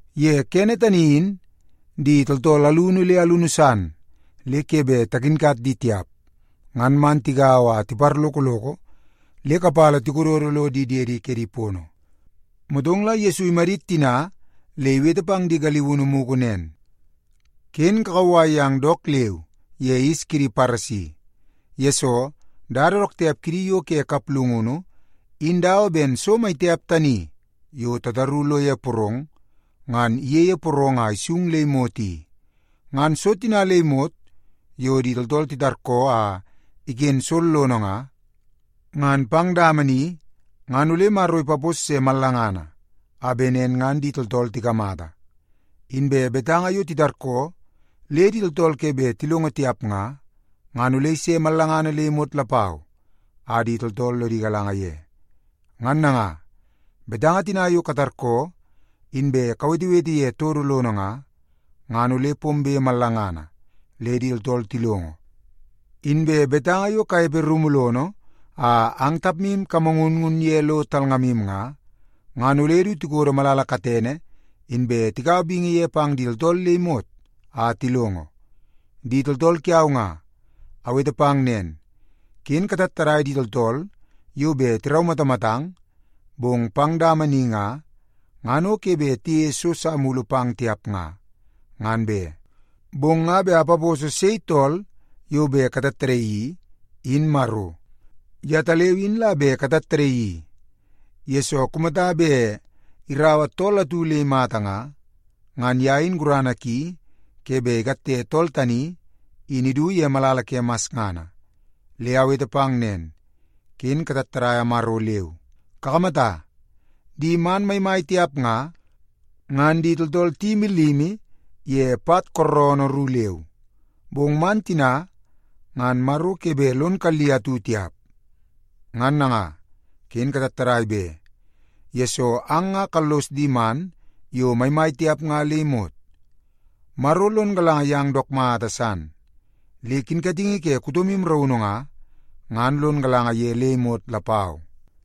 Ye kene tani in di tooltool alunu le alunu san le ke bet takinkat di tiap ngan man tigaua a tiparlokoloko le kapala tikododo lo di diedi kedi pono. Motong la Yesu imadit tina le iwete pang di galiunu mugu nen, “Ken kakauwai yang dook leu ye yis kidi Paresi. Yesoo, dada dook tiap kidi yo ke kaplungunu in dawa ben so mai tiap tani yo tataru lo ye porong ngan iyeie porong a isung le imot i. Ngan so tina le imot yo di tooltool titarkoo a iken sollono nga, ngan pang dama ni ngan ole Maro ipapos se mallangana a bet nen ngan di tooltool tikamata. Inbe betanga yo titarkoo le di tooltool ke bet tilongo tiap nga, ngan ole ise mallangana le imot lapau a di tooltool lodi galanga ye. Ngan nanga, betanga tina yo katarkoo inbe kawetewete ye todo lono nga, ngan ole pombe mallangana le di tooltool tilongo. Inbe betanga yo kanepe rumu lono a ang tapmu kamangunngun ye lo talngamu nga, ngan ole du tikodo malala katene, inbe tikaua bingi ye pang di tooltool le imot a tilongo. “Di tooltool kiau nga, awete pang nen, ken katattadai di tooltool yo bet tiraumatamatang, bong pang dama ni nga, ngan o ke bet tiyeie so sa mulu pang tiap nga, ngan be. Bong nga bet apaposo sei tool yo bet katattadaii i, in Maro. Yetaleu in la bet katattadaii i, yesoo kumata bet iraua tool atu le imata nga, ngan ye in gurana ki ke bet ikatte tool tani, in idu ye malala ke masngana. Le awete pang nen, ken katattadaia Maro leu. Kakamata, di man maimai tiap nga, ngan di tooltool tiyimi limi ye pat kooroonoo ru leu. Bong man tina ngan Maro ke bet lon kalli atu tiap. Ngan nanga, ken katattadai be, yesoo ang nga kallos di man yo maimai tiap nga le imot. Maro lon galanga yang dook mata san, le kinkatingi ke kutomu raunu nga, ngan lon galanga ye le imot lapau.”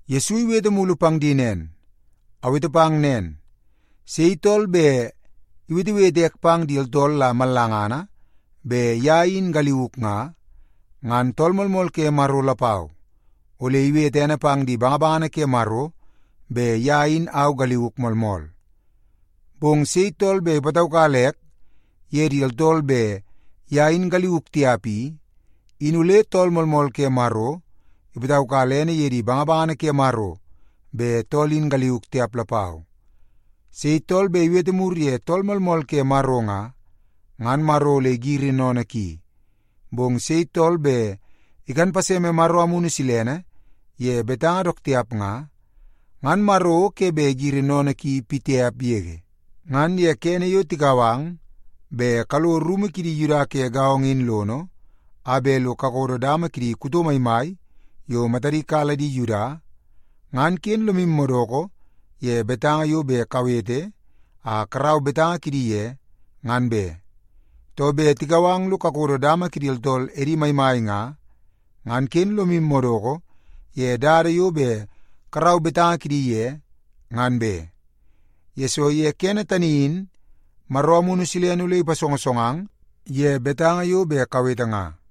Yesu iwete mulu pang di nen, “Awete pang nen, sei tool bet iwetewete ek pang di tooltool la mallangana bet ye in au galiuk nga, ngan Tool Moolmool ke Maro lapau, ole iwete ene pang di bangabangana ke Maro bet ye in galiuk moolmool. Bong sei tool bet ipataukala ek ye di tooltool bet ye in galiuk tiap i, in ole Tool Moolmool ke Maro ipataukala ene ye di bangabangana ke Maro bet tool in galiuk tiap lapau. Sei tool bet iwete mur ye Tool Moolmool ke Maro nga, ngan Maro ole igiri sennene ki. Bong sei tool bet ikan paseme Maro Amunu Silene ye betanga dook tiap nga, ngan Maro o ke bet igiri sennene ki pitiap yege. “Ngan ye kene yo tikau ang bet kalo rumu kidi Yuda ke gaongo in lono a bet lo kakodo dama kidi kuto maimai yo matadi kala di Yuda, ngan ken lomu madoko ye betanga yo bet kawete a karau betanga kidi ye, ngan be. Too, bet tikau ang lo kakodo dama kidi tooltool edi maimai nga, ngan ken lomu madoko ye dada yo bet karau betanga kidi ye, ngan be. Yesoo ye kene tani in Maro Amunu Silene ole ipasongosongang ye betanga yo bet kawete nga.”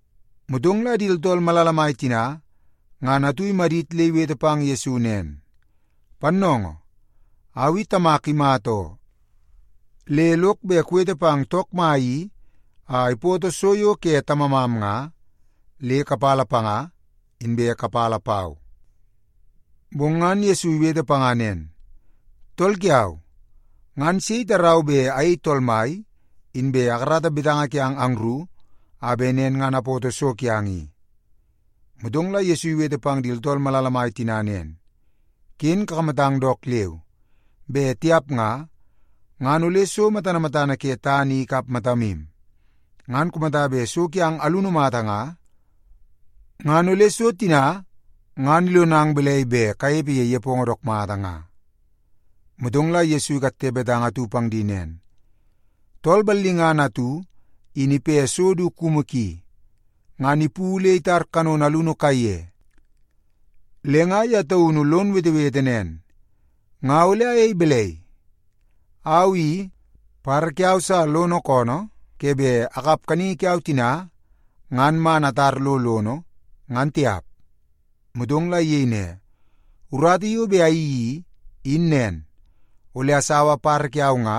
Motong la di tooltool malala mai tina, ngan atu imadit le iwete pang Yesu nen, “Pannoongoo, au i tamak imata oo. Le lok bet kuwete pang took mai i a ipoto so yo ke tamamam nga, le kapala panga, inbe kapala pau.” Bong ngan Yesu iwete panga nen, “Tool kiau, ngan sei itarau bet ayei tool mai, inbe akarata betanga kiang angru, a bet nen ngan apoto so kiang i?” Motong la Yesu iwete pang di tooltool malala mai tina nen, “Ken kakamatang dook leu! Bet tiap nga, ngan ole so matana matana ke tana i ikap matamu. Ngan kumata bet so kiang alunu mata nga, ngan ole so tina ngan ilonang balai bet kanepe ye nepongo dook mata nga?” Motong la Yesu ikatte betanga atu pang di nen, “Tool ballingana atu in ipe so du kumu ki, ngan ipu le itar kanono alunu kaiye. Le nga ye taunu lon wetewete nen, ‘Nga ole ayei balai? Au i, badabada kiau sa lono koonoo ke bet akap kaningi kiau tina ngan man atar lo lono, ngan tiap.’ Motong la iyei ne, ‘Urata yo bet ayeii i, in nen. Ole asaua badabada kiau nga,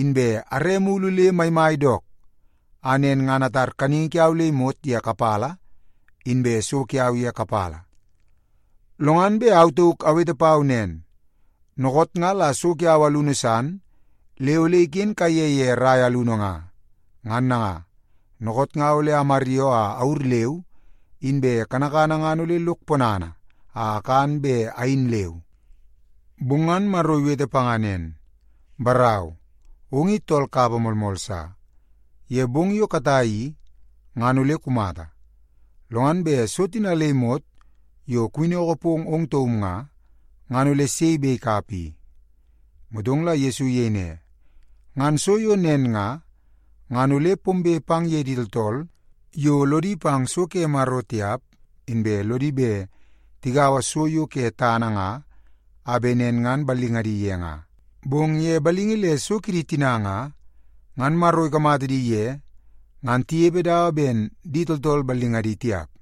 inbe are mulu le maimai dook, a nen ngan atar kaningi kiau le imot ye kapala, inbe so kiau ye kapala. Lo ngan bet au tauk awete pau nen, “Dookoot nga la so kiau alunu san le ole iken kaiye ye rai alunu nga. Ngan nanga, dookoot nga ole amaryoo a awur leu, inbe kanakana ngan ole lok ponana a akan be ayin leu.” ’ “Bong ngan Maro iwete panga nen, ‘Barau, ong i tool kapa moolmool sa. Ye bong yo katai i, ngan ole kumata. Lo ngan bet so tina le imot yo kuwinnoko pong ong taum nga, ngan ole sei bet ikap i?’” Motong la Yesu iyei ne, “Ngan so yo nen nga, ngan ole pombe pang ye di tooltool yo lodi pang so ke Maro tiap, inbe lodi bet tigaua so yo ke tana nga a bet nen ngan ballingadi ye nga. Bong ye balingi le so kidi tina nga, ngan Maro ikamata di ye ngan tinepe dawa ben di tooltool ballingadi tiap.”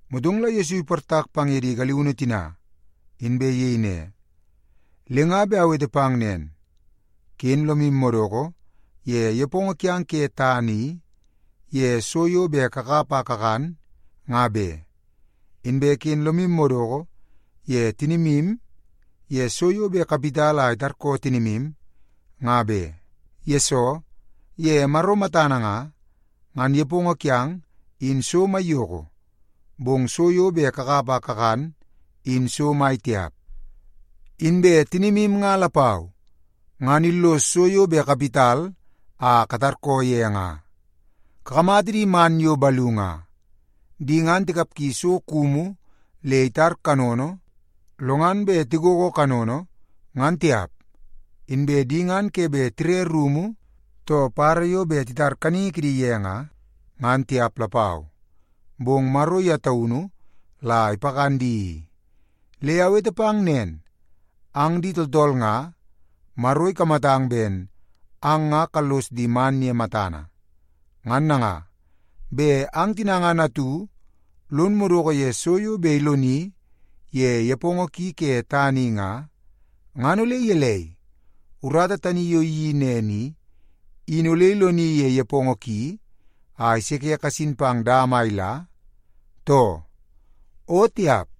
Motong la Yesu iportak pang ye di galiunu tina, inbe iyei ne, “Le nga bet awete pang nen, ken lomu madoko ye nepongo kiang ke tana i, ye so yo bet kakap a kakan, nga be. Inbe ken lomu madoko ye tinimu ye so yo bet kawit a itarkoo tinimu, nga be. Yesoo, ye Maro matana nga, ngan nepongo kiang, in so maiyoko, bong so yo bet kakap a kakan, in so mai tiap. Inbe tinimu nga lapau, ngan illoso so yo bet kawit a katarkoo ye nga. Kakamata di man yo balu nga. Di ngan tikapgi so kumu le itar kanono, lo ngan bet lo tigogo kanono, ngan tiap. Inbe di ngan ke bet tire rumu too badabada yo bet titar kaningi kidi ye nga, ngan tiap lapau. Bong Maro ye taunu la ipakan di i. Le awete pang nen, ang di tooltool nga, Maro ikamatang ben ang nga kallos di man ye matana. Ngan nanga, bet ang tina ngan atu lon madoko ye so yo bet iloni ye nepongo ki ke tana i nga, ngan ole gelei, urata tani yo iyeii nen i, in ole iloni ye nepongo ki a iseke kasin pang dama a ila, too? O tiap!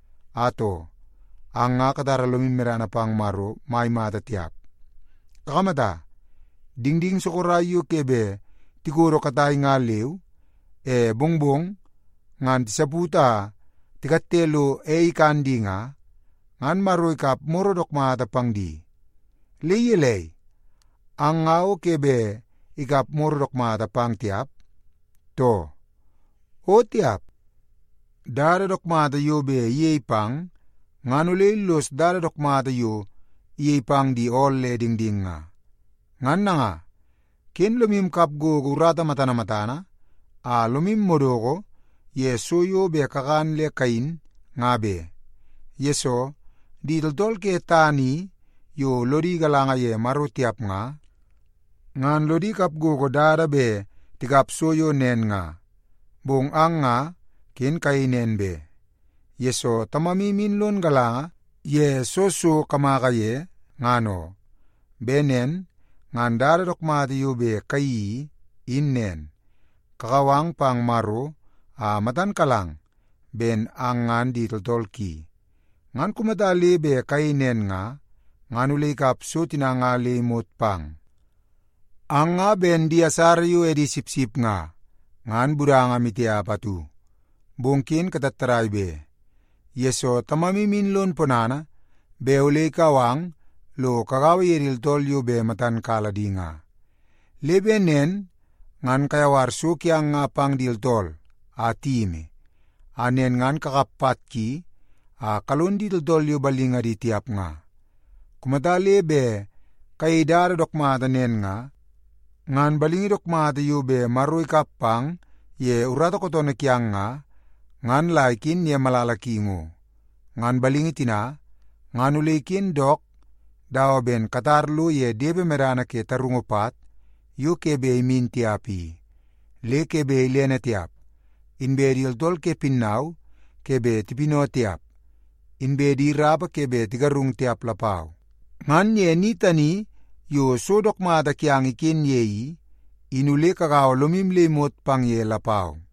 Atoo, ang nga katara lomu medana pang Maro mai mata tiap. Kakamata, dingding sorok yo ke bet tikodo katai nga leu, e mongmong ngan tisaput a tikatte lo ei ikan di nga, ngan Maro ikap moro dook mata pang di. Le gelei, ang nga o ke bet ikap moro dook mata pang tiap, too? O tiap! Dada dook mata yo bet iyei pang ngan ole illos dada dook mata yo iyei pang di ool le dingding nga. Ngan nanga, ken lomu kap gogo urata matana matana a lomu madoko ye so yo bet kakan le kayin nga be. Yesoo, di tooltool ke tana i yo lodi galanga ye Maro tiap nga, ngan lodi kap gogo dada bet tikap so yo nen nga. Bong ang nga ken kayei nen be, yesoo Tamamu in lon galanga ye soo so kamaka ye, ngan oo. Bet nen ngan dada dook mata yo bet kayeii i, in nen. Kakau ang pang Maro a matan kalang ben ang ngan di tooltool ki. Ngan kumata le bet kayei nen nga, ngan ole ikap so tina nga le imot pang. “Ang nga ben di asara yo edi sipsip nga, ngan budanga maitiap atu. Bong ken katattadai be, yesoo Tamamu in lon ponana bet ole ikau ang lo kagaua ye di tooltool yo bet matan kala di nga. Le bet nen ngan kayawar so kiang nga pang di tooltool a tiyimi, a nen ngan kakap pat ki a kalon di tooltool yo ballingadi tiap nga. Kumata le bet kayei dada dook mata nen nga, ngan balingi dook mata yo bet Maro ikap pang ye urata kootoonoo kiang nga, ngan la iken ye malala ki ngo. Ngan balingi tina, ngan ole iken dook dawa ben katar lo ye depe medana ke tarungu pat yo ke bet imin tiap i. Le ke bet ilene tiap, inbe di tooltool ke pinnau ke bet tipinau tiap, inbe di rapa ke bet tigarungu tiap lapau. Ngan ye ni tani yo so dook mata kiang iken ye i, in ole kagaua lomu le imot pang ye lapau.”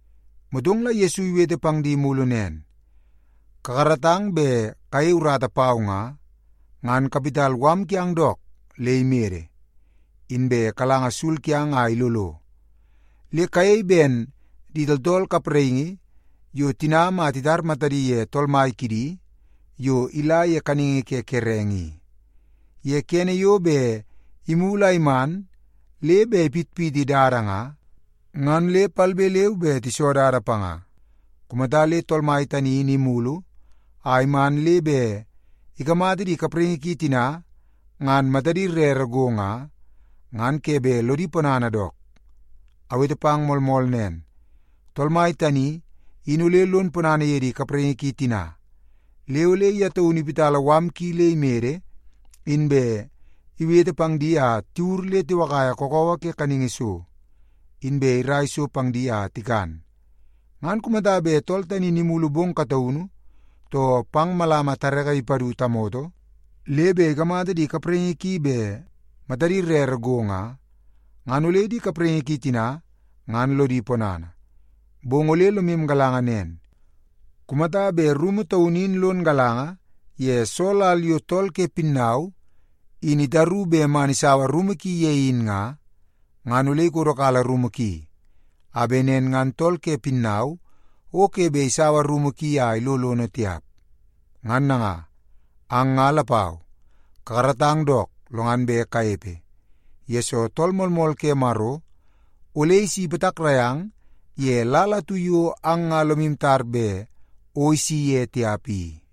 Motong la Yesu iwete pang di mulu nen, “Kakaratang bet kayei urata pau nga, ngan kawit mala kiang dook le imede, inbe kalanga sul kiang a ilolo. Le kayei ben di tooltool kapraingi yo tinam a titar matadi ye tool mai kidi yo ila ye kaningi ke kerenge i. Ye kene yo bet imulu a iman le bet ipitpiti dada nga, ngan le palbe leu be tiso dada panga. Kumata le tool mai tani in imulu a iman le bet ikamata di kapraingi ki tina ngan matadi rere go nga, ngan ke bet lodi ponana dook. Awete pang moolmool nen, tool mai tani in ole lon ponana ye di kapraingi ki tina, le ole ye taunu iwiti mala ki le imede, inbe iwete pang di a tiwur le tiwakaia kakawa ke kaningi so, inbe irai so pang di a tikan. Ngan kumata bet tool tani in imulu bong kataunu, too pang malama tareke ipadu tamoto, le bet ikamata di kapraingi ki bet matadi rere go nga, ngan ole di kapraingi ki tina ngan lodi ponana. Bong ole lomu galanga nen. Kumata bet rumu taunu in lon galanga ye soo lal yo tool ke pinnau in itaru bet man isaua rumu ki ye in nga, ngan ole ikodokala rumu ki, a bet nen ngan tool ke pinnau o ke bet isaua rumu ki a ilo lono tiap. Ngan nanga, ang nga lapau kakaratang dook, lo ngan bet kanepe, yesoo Tool Moolmool ke Maro ole isi ipatakrai ang ye lal atu yo ang nga lomu tar bet o isi ye tiap i.”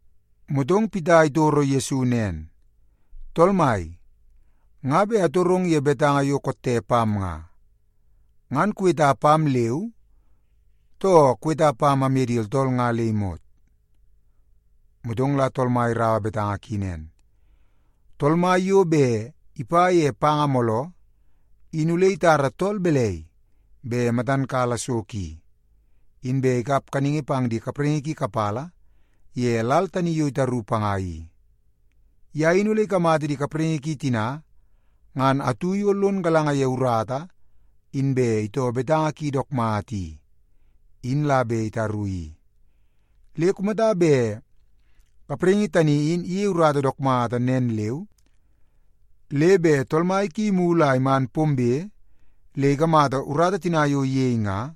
Motong Pita itoro Yesu nen, “Tool Mai, nga bet atorong ye betanga yo kotte pam i. Ngan kuweta pam leu, too kuweta pam amye di tooltool nga le imot?” Motong la Tool Mai iraua betanga ki nen, “Tool mai yo bet ipa ye panga mooloo, in ole itara tool balai bet matan kala so ki, inbe ikap kaningi pang di kapraingi ki kapala ye lal tani yo itaru panga i? Ye in ole ikamata di kapraingi ki tina ngan atu yo lon galanga ye urata inbe itoo betanga ki dook mata i, in la bet itaru i. Le kumata bet kapraingi tani in iyei urata dook mata nen leu, le bet tool mai ki imulu a iman pombe le ikamata urata tina yo iyei nga,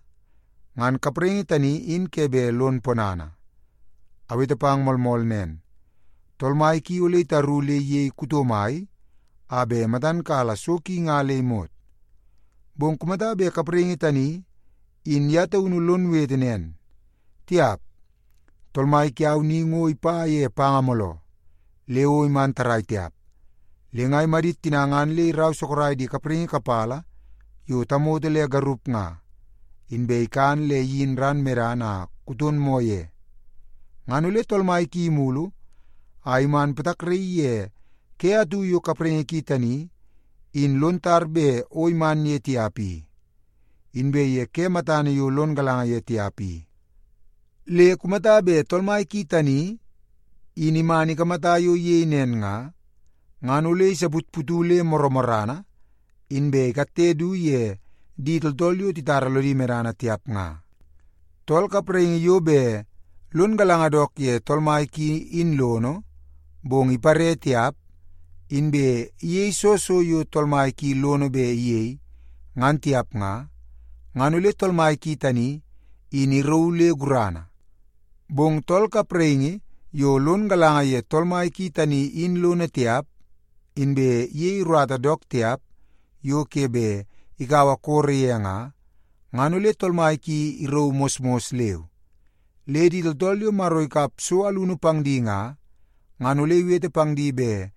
ngan kapraingi tani in ke bet lon ponana. Awete pang moolmool nen, tool mai ki ole itaru le iyei kuto mai a bet matan kala so ki nga le imot. Bong kumata bet kapraingi tani in ye taunu lon wete nen, ‘Tiap. Tool mai kiau ni ngo ipa ye panga mooloo le o iman tarrai tiap,’ le nga imadit tina ngan le irau sorok di kapraingi kapala yo tamoto le garup nga, inbe ikan le iyin ran medana a kuton moo ye. Ngan ole tool mai ki imulu a iman ipatakraii ye ke atu yo kapraingi ki tani in lon tar bet o iman ye tiap i, inbe ye ke matana yo lon galanga ye tiap i. Le kumata bet tool mai ki tani in iman ikamata yo iyei nen nga, ngan ole isaputputu le morrana, inbe ikatte du ye di tooltool yo titara lodi medana tiap nga. “Tool kapraingi yo bet lon galanga dook ye tool mai ki in lono, bong ipare tiap, inbe iyei soo so yo tool mai ki lono bet iyei, ngan tiap nga, ngan ole tool mai ki tani in irauu le gurana. Bong tool kapraingi yo lon galanga ye tool mai ki tani in lono tiap, inbe iyei urata dook tiap yo ke bet ikaua koro ye nga, ngan ole tool mai ki irauu mosmos leu. Le di tooltool yo Maro ikap so alunu pang di nga, ngan ole iwete pang di bet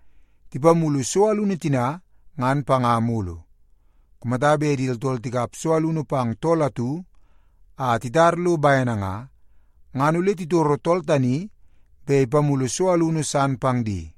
tipamulu so alunu tina ngan panga mulu. Kumata bet di tooltool tikap so alunu pang tool atu a titar lo bene nga, ngan ole titoro tool tani bet ipamulu so alunu san pang di.”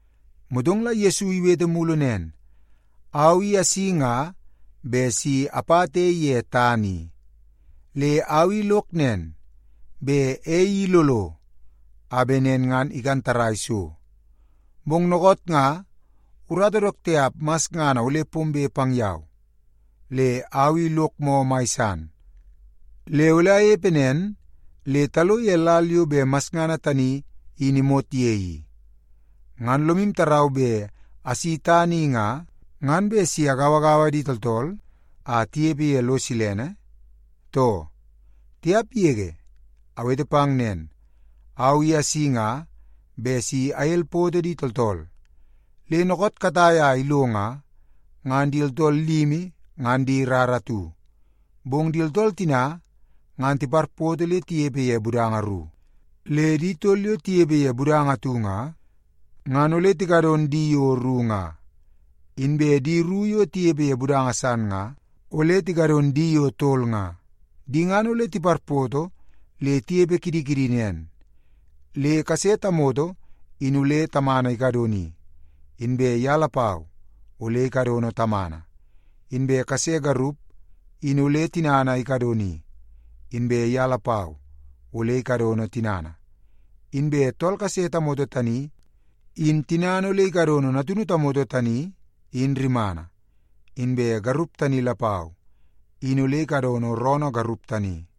Motong la Yesu iwete mulu nen, “Au i asi nga bet si apata ei ye tana i. Le au i lok nen, bet ei i ilolo a bet nen ngan ikan tarrai so. Bong dookoot nga urata dook tiap masngana ole pombe pang yau, le au i lok moo mai san, le ole anepe nen le talo ye lal yo bet masngana tani in imot ye i. Ngan lomu tarau bet asi tana i nga, ngan bet si agauagaua di tooltool a tinepe ye lo silene, too? Tiap yege! Awete pang nen, au i asi nga bet si agelpoto di tooltool. Le dookoot katai a ilo nga, ngan di tooltool limi ngan di rara atu, bong di tooltool tina ngan tiparpoto le tinepe ye budanga ru. Le di tol yo tinepe ye budanga atu nga, ngan ole tikadon di yo ru nga. Inbe di ru yo tinepe ye budanga san nga, ole tikadon di yo tol nga. Di ngan ole tiparpoto le tinepe kidi kidi nen, le kase tamoto in ole tamana ikadoni, inbe ye lapau ole ikadono tamana. Inbe kase garup in ole tinana ikadoni, inbe ye lapau ole ikadono tinana. Inbe tool kase tamoto tani in tinana ole ikadono natunu tamoto tani in rimana, inbe garup tani lapau, in ole ikadono roonoo garup tani.”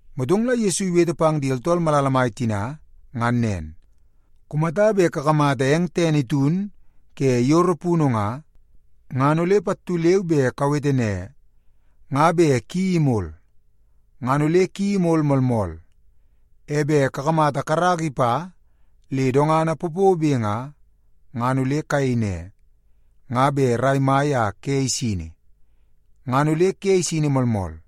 Motong la Yesu iwete pang di tooltool malala mai tina ngan nen, “Kumata bet kakamata eng tene itun ke yoro punu nga, ngan ole pattu leu be kawete ne, ‘Nga bet ki imol.’ Ngan ole ki imol moolmool. E bet kakamata karaka ipa le dongana popobe nga, ngan ole kayei ne, ‘Nga bet rai mai a ke isini.’ Ngan ole ke isini moolmool.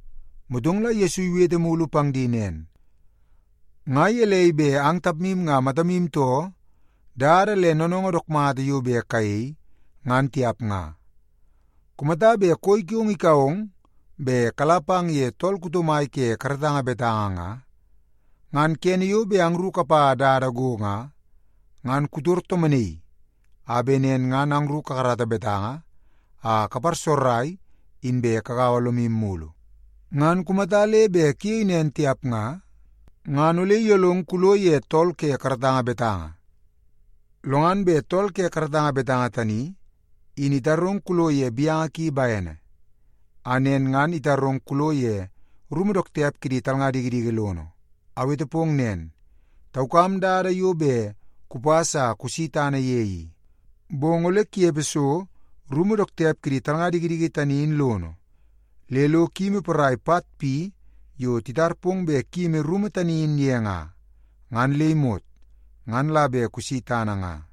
Motong la Yesu iwete mulu pang di nen, “Nga gelei bet ang tapmu nga matamu too dada le noonoongoo dook mata yo bet kayei, ngan tiap nga? Kumata bet koi kiong ikau ong bet kala pang ye tool kuto mai ke karatanga betanga nga, ngan kene yo bet angru kapa dada go nga, ngan kutor tomonaii a bet nen ngan angru kakarata betanga a kaparsogorai inbe kagau lomu mulu. Ngan kumata le bet kuyei nen tiap nga, ngan ole iyolong kulo ye tool ke karatanga betanga, lo ngan bet tool ke karatanga betanga tani in itarong kulo ye gaunu ki bene, a nen ngan itarong kulo ye rumu dook tiap kidi talnga dikidiki lono. Awete pong nen, taukam dada yo bet kupas a kusi tana ye i. Bong ole kunepe so rumu dook tiap kidi talnga dikidiki tani in lono, le lo kuyimi porai pat pi yo titar pong bet kuyimi rumu tani in ye nga, ngan le imot, ngan la bet kusi tana nga.”